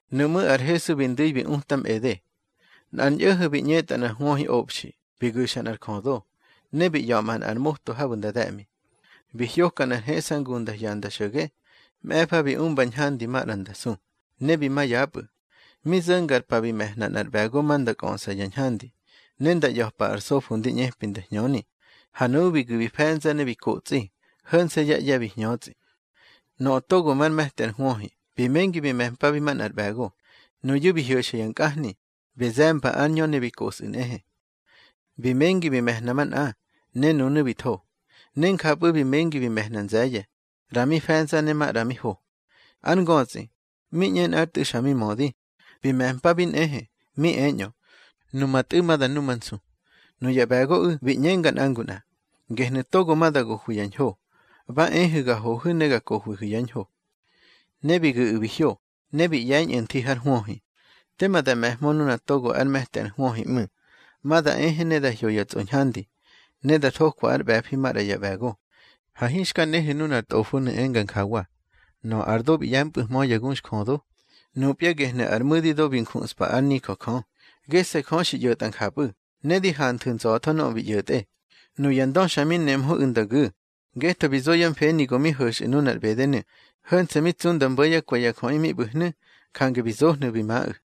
Nuꞌmú̱ ar Hesu bi ndu̱i mi utamꞌede: —Nꞌar ñꞌo̱ho̱ bi ꞌñetꞌa nꞌar hwöhiꞌobxi, bi guxa nꞌar jödo, ne bi ꞌya̱ꞌma nꞌar moto habu̱ nda de̱ꞌmi. Bi hyoka nꞌar heꞌsangu nda hyanda xo̱ge. Mꞌe̱fa bi umba ñhandi maꞌra nda su, ne bi ma yapꞌu̱. Mi zo̱nga ar pa bi me̱hna nꞌar ꞌbe̱go ma nda kꞌöꞌsa ya ñhandi, ne nda ꞌya̱pa ar sofo ndi ꞌñepi nda hñöni. Ha nuꞌu̱ bi gu̱ bi fe̱nza ne bi kotsꞌi, ho̱nse̱ yá ꞌye̱ bi hñötsꞌi. Nöꞌö togo már me̱ti ar hwöhi, bi mengi bi me̱mpabi manꞌar ꞌbe̱go. Nuyu̱ bi hyo̱xa ya nkꞌahni, bi ze̱mba ár ñö ne bi kosꞌu̱ nꞌehe. Bi mengi bi me̱hna manꞌa, ne nunu̱ bi tho. Ne njapꞌu̱ bi mengi bi me̱hna nze̱ye̱, ꞌra mi fe̱nza ne maꞌra mi ho. Ár ngötsꞌi, mi ꞌñe nꞌár tꞌu̱ xa mi mödi, bi me̱mpabi nꞌehe, mi eñꞌö: Numa tꞌu̱ ma da numansu. Nuya ꞌbe̱goꞌu̱ bi ꞌñenga nꞌa ngu nꞌa: Gehnu̱ togo ma da gohwi ya ñho. Ba ehu̱ ga hohu̱ ne ga kohwihu̱ yá ñho. Ne bi gu̱ꞌu̱ bi hyo, ne bi ꞌye̱ñꞌu̱ nthi har hwöhi. Tema da me̱hmö nuna togo ár me̱ti ar hwöhi ꞌmu̱. Ma da ehe ne da hyo ya tsꞌoñhandi, ne da thokwa ár ꞌbe̱fi maꞌra ya ꞌbe̱go. Ha hinxka nehu̱ nunar tꞌofonu̱ enga njawa: Nöꞌö ar do bi ꞌye̱mpꞌu̱hmö ya guxjödo, nupya gehnu̱ ar mu̱di do xi njuꞌspa ár nijö Jö. Gese̱ Jö xi ꞌyo̱tꞌa njapꞌu̱, ne di hanthu̱ nza̱tho nöꞌö bi ꞌyo̱tꞌe. Nuya ndö xa mi nemhöꞌu̱ nda gu̱, ngetho bi zo yá mfeni go mi ho̱xꞌu̱ nunar ꞌbedenu̱. Ho̱nse̱ mi tsu nda mbo̱ yá kwe̱ ya jöꞌi mi ꞌbu̱hnu̱, jange bi zohnu̱ bi maꞌu̱.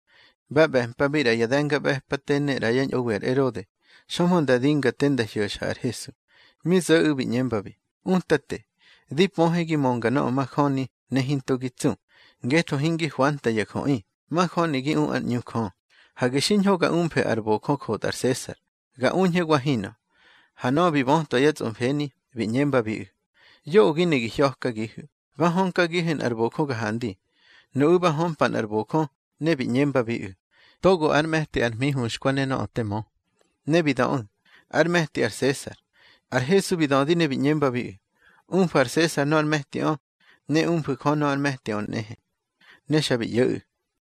Ba ꞌbe̱mpabi ꞌra ya de̱ngaꞌbe̱pate ne ꞌra yá ñꞌowi ar Erode, xömhö nda dinga te nda hyo̱xa ar Hesu. Mi zo̱ꞌu̱ bi ꞌñembabi: —Utate, di pöhe gi mönga nöꞌö majöni, ne hinto gi tsu, ngetho hingi hwanta ya jöꞌi, majöni gi u ár ꞌñu Jö. Hage xiñho ga umfe ar bojö jotꞌa ar Sesar. Ga uñhe wa hinꞌö. Ha nöꞌö bi bötwa yá tsꞌomfeni, bi ꞌñembabiꞌu̱: —Yoꞌö gi ne gi hya̱kagihu̱. Ba hönkagihu̱ nꞌar bojö ga handi. Nuꞌu̱ ba hömpa nꞌar bojö, ne bi ꞌñembabiꞌu̱: —Togo ár me̱ti ar hmi huxkwa ne nöꞌö te mö. Ne bi döꞌu̱: —Ár me̱ti ar Sesar. Ar Hesu bi dödi ne bi ꞌñembabiꞌu̱: —Umfu̱ ar Sesar nöꞌö ár me̱tiꞌö, ne umfu̱ Jö nöꞌö ár me̱tiꞌö nꞌehe. Ne xa bi ꞌyo̱ꞌu̱.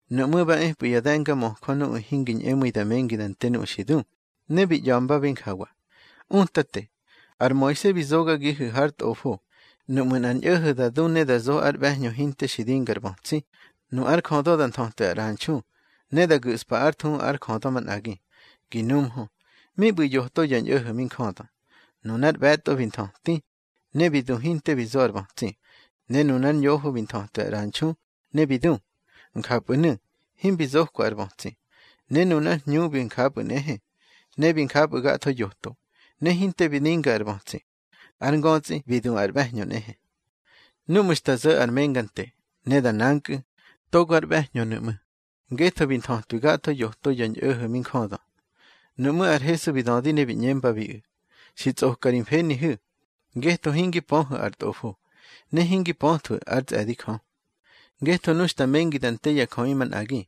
Nuꞌmú̱ ba epꞌu̱ ya de̱ngamöjö nuꞌu̱ hingi ñꞌemu̱i da mengi da nte nuꞌu̱ xi du, ne bi ꞌya̱mbabi njawa: —Utate, ar Moise bi zogagihu̱ har tꞌofo, nuꞌmu̱ nꞌar ñꞌo̱ho̱ da du ne da zo ár ꞌbe̱hñö hinte xi dinga ar bötsi, nu ár jödö da nthötwi ar ꞌranxu, ne da gu̱ꞌspa ár thuhu ár jödö manꞌagi. Gi numhö: Mi ꞌbu̱ yoto ya ñꞌo̱ho̱ mi njödö. Nunar ꞌbe̱tꞌo bi nthöti, ne bi du hinte bi zo ar bötsi. Ne nunár ñoho bi nthötwi ar ꞌranxu, ne bi du. Njapꞌu̱nu̱ himbi zokwa ar bötsi, ne nunár hñu bi njapꞌu̱ nꞌehe. Ne bi njapꞌu̱ gatho yoto, ne hinte bi dinga ar bötsi. Ár ngötsꞌi bi du ar ꞌbe̱hñö nꞌehe. Núꞌmu̱ xta zo̱ ar menga nte, ne da nankꞌu̱, togo ár ꞌbe̱hñönu̱ ꞌmu̱, ngetho bi nthötwi gatho yoto ya ñꞌo̱ho̱ mi njödö. Nuꞌmú̱ ar Hesu bi dödi ne bi ꞌñembabiꞌu̱: —Xi tsꞌoka ri mfenihu̱, ngetho hingi pöhu̱ ar Tꞌofo, ne hingi pöthwu̱ ár tsꞌe̱di Jö. Ngetho nu xta mengi da nte ya jöꞌi manꞌagi,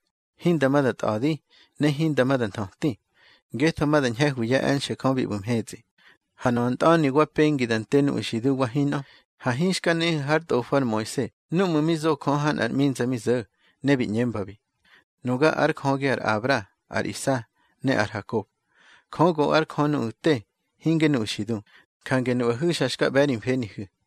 hinda ma da tꞌa̱di, ne hinda ma da nthöti, ngetho ma da ñhe̱hwi yá e̱nxe̱ Jö bi ꞌbu̱ mhetsꞌi. Ha nöꞌö ntꞌa̱ni wa pengi da nte nuꞌu̱ xi du wa hinꞌö, ha hinxka nehu̱ hár tꞌofo ar Moise núꞌmu̱ mi zo Jö ha nꞌar ꞌminza mi zo̱, ne bi ꞌñembabi: Nuga ár Jögi ar Abra, ar Isa, ne ar Hakob. Jö go ár Jö nuꞌu̱ te, hinge nuꞌu̱ xi du. Jange nuꞌahu̱ xa xka ꞌbe̱ ri mfenihu̱.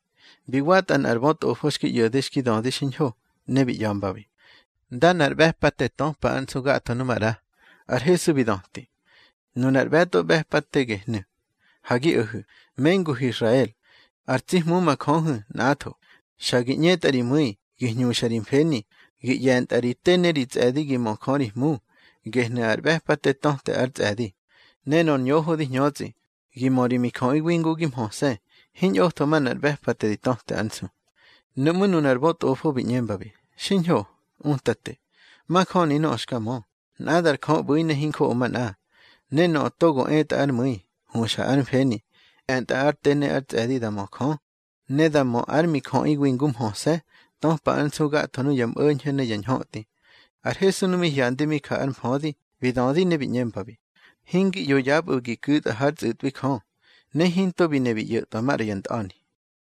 Bi watꞌa nꞌar bötꞌofo xki ꞌyo̱de xki dödi xiñho, ne bi ꞌya̱mbabi: —Ndana ar ꞌbe̱pate töpa ár nsu gatho nu maꞌra. Ar Hesu bi döti: —Nunar ꞌbe̱tꞌo ꞌbe̱pate gehnu̱: Ha gi o̱hu̱, menguhu̱ Israel. Ar tsi Hmu ma Jöhu̱, nꞌatho. Xa gi ꞌñetꞌa ri mu̱i, gi hñuxa ri mfeni, gi ꞌye̱ntꞌa ri te ne ri tsꞌe̱di gi mö Jö ri Hmu. Gehnu̱ ar ꞌbe̱pate töte ár tsꞌe̱di. Ne nor ñoho di hñötsꞌi: Gi mö ri mijöꞌiwi ngu gi mhöse̱. Hiñꞌotho manꞌar ꞌbe̱pate di töte ár nsu. Nuꞌmú̱ nunar bötꞌofo bi ꞌñembabi: —Xiñho, Utate. Majöni nöꞌö xka mö, nꞌadar Jö ꞌbu̱i ne hinjoꞌo manꞌa. Ne nöꞌö togo etꞌa ár mu̱i, huxa ár mfeni, e̱ntꞌa ár te ne ár tsꞌe̱di da mö Jö, ne da mö ár mijöꞌiwi ngu mhöse̱, töpa ár nsu gatho nuya mꞌo̱ñho̱ ne ya ñhötꞌi. Ar Hesu nu mi hyandi mi ja ár mfödi, bi dödi ne bi ꞌñembabi: —Hingi ꞌyo yapꞌu̱ gi ku̱tꞌa hár tsꞌu̱tꞌwi Jö. Ne hinto bi ne bi ꞌyo̱tꞌwa maꞌra ya ntꞌa̱ni.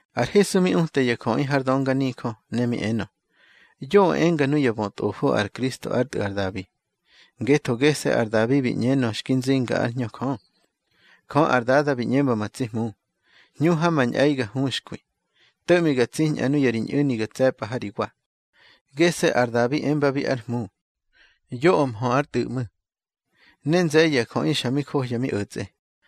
Ar Hesu mi uta ya jöꞌi har dönganijö, ne mi enö: —Yoꞌö enga nuya bötꞌofo ar Kristo ár tꞌu̱ ar Dabi. Ngetho gese̱ ar Dabi bi ꞌñenö xki nzinga ár Hñö Jö: Jö ar Dada bi ꞌñemba ma tsi Hmu: Hñu ha ma ñꞌe̱i ga huxkwi, to̱ꞌmi ga tsiñꞌa nuya ri ñꞌu̱ni ga tse̱pꞌa ha ri wa. Gese̱ ar Dabi embabi ár Hmu. Yoꞌö mhö ár tꞌu̱ ꞌmu̱. Ne nze̱ye̱ ya jöꞌi xa mi johya mi o̱tsꞌe.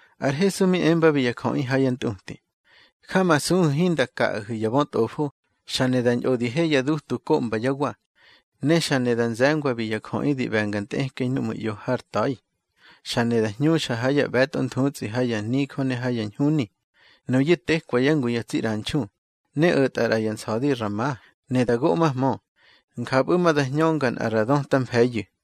Ar Hesu mi embabi ya jöꞌi ha yá ntꞌuti: —Jamasuhu̱ hinda kaꞌahu̱ ya bötꞌofo, xa ne da ñꞌo di he yá dutu koꞌmba yá wa, ne xa ne da nze̱ngwabi ya jöꞌi di ꞌbe̱nga ntꞌekꞌei núꞌmu̱ ꞌyo har ta̱i. Xa ne da hñuxa ha ya ꞌbe̱tꞌo nthutsꞌi ha ya nijö ne ha ya ñhuni. Nuyu̱ tekwa yá ngu ya tsi ꞌranxu, ne o̱tꞌa ꞌra ya nsa̱di ra ma, ne da goꞌmahmö. Njapꞌu̱ ma da hñönga nꞌa ra döta mfe̱iyu̱.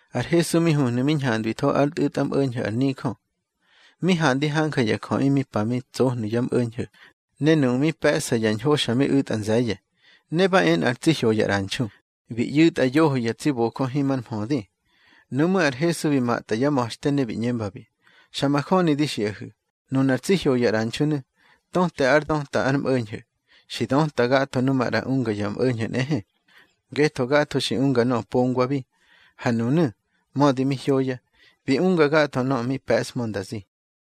Ar Hesu mi huhnu̱ mi ñhandwitho ár ntꞌu̱tmꞌo̱ñho̱ ar nijö. Mi handi hanja ya jöꞌi mi pa mi tsohnu̱ yá mꞌo̱ñho̱, ne nuꞌu̱ mi pe̱ꞌsa yá ñho xa mi u̱tꞌa nze̱ye̱. Ne ba e nꞌar tsi hyoya ꞌranxu, bi ꞌyu̱tꞌa yoho ya tsi bojö himar mhödi. Nuꞌmú̱ ar Hesu bi matꞌa yá ma̱xte, ne bi ꞌñembabi: —Xa majöni di xiꞌahu̱, nunar tsi hyoya ꞌranxunu̱, töte ár döta ár mꞌo̱ñho̱, xi döta gatho nu maꞌra unga yá mꞌo̱ñho̱ nꞌehe. Ngetho gatho xi unga nöꞌö pongwabi. Ha nunu̱, mödi mi hyoya, bi unga gatho nöꞌö mi pe̱ꞌshmö nda zi.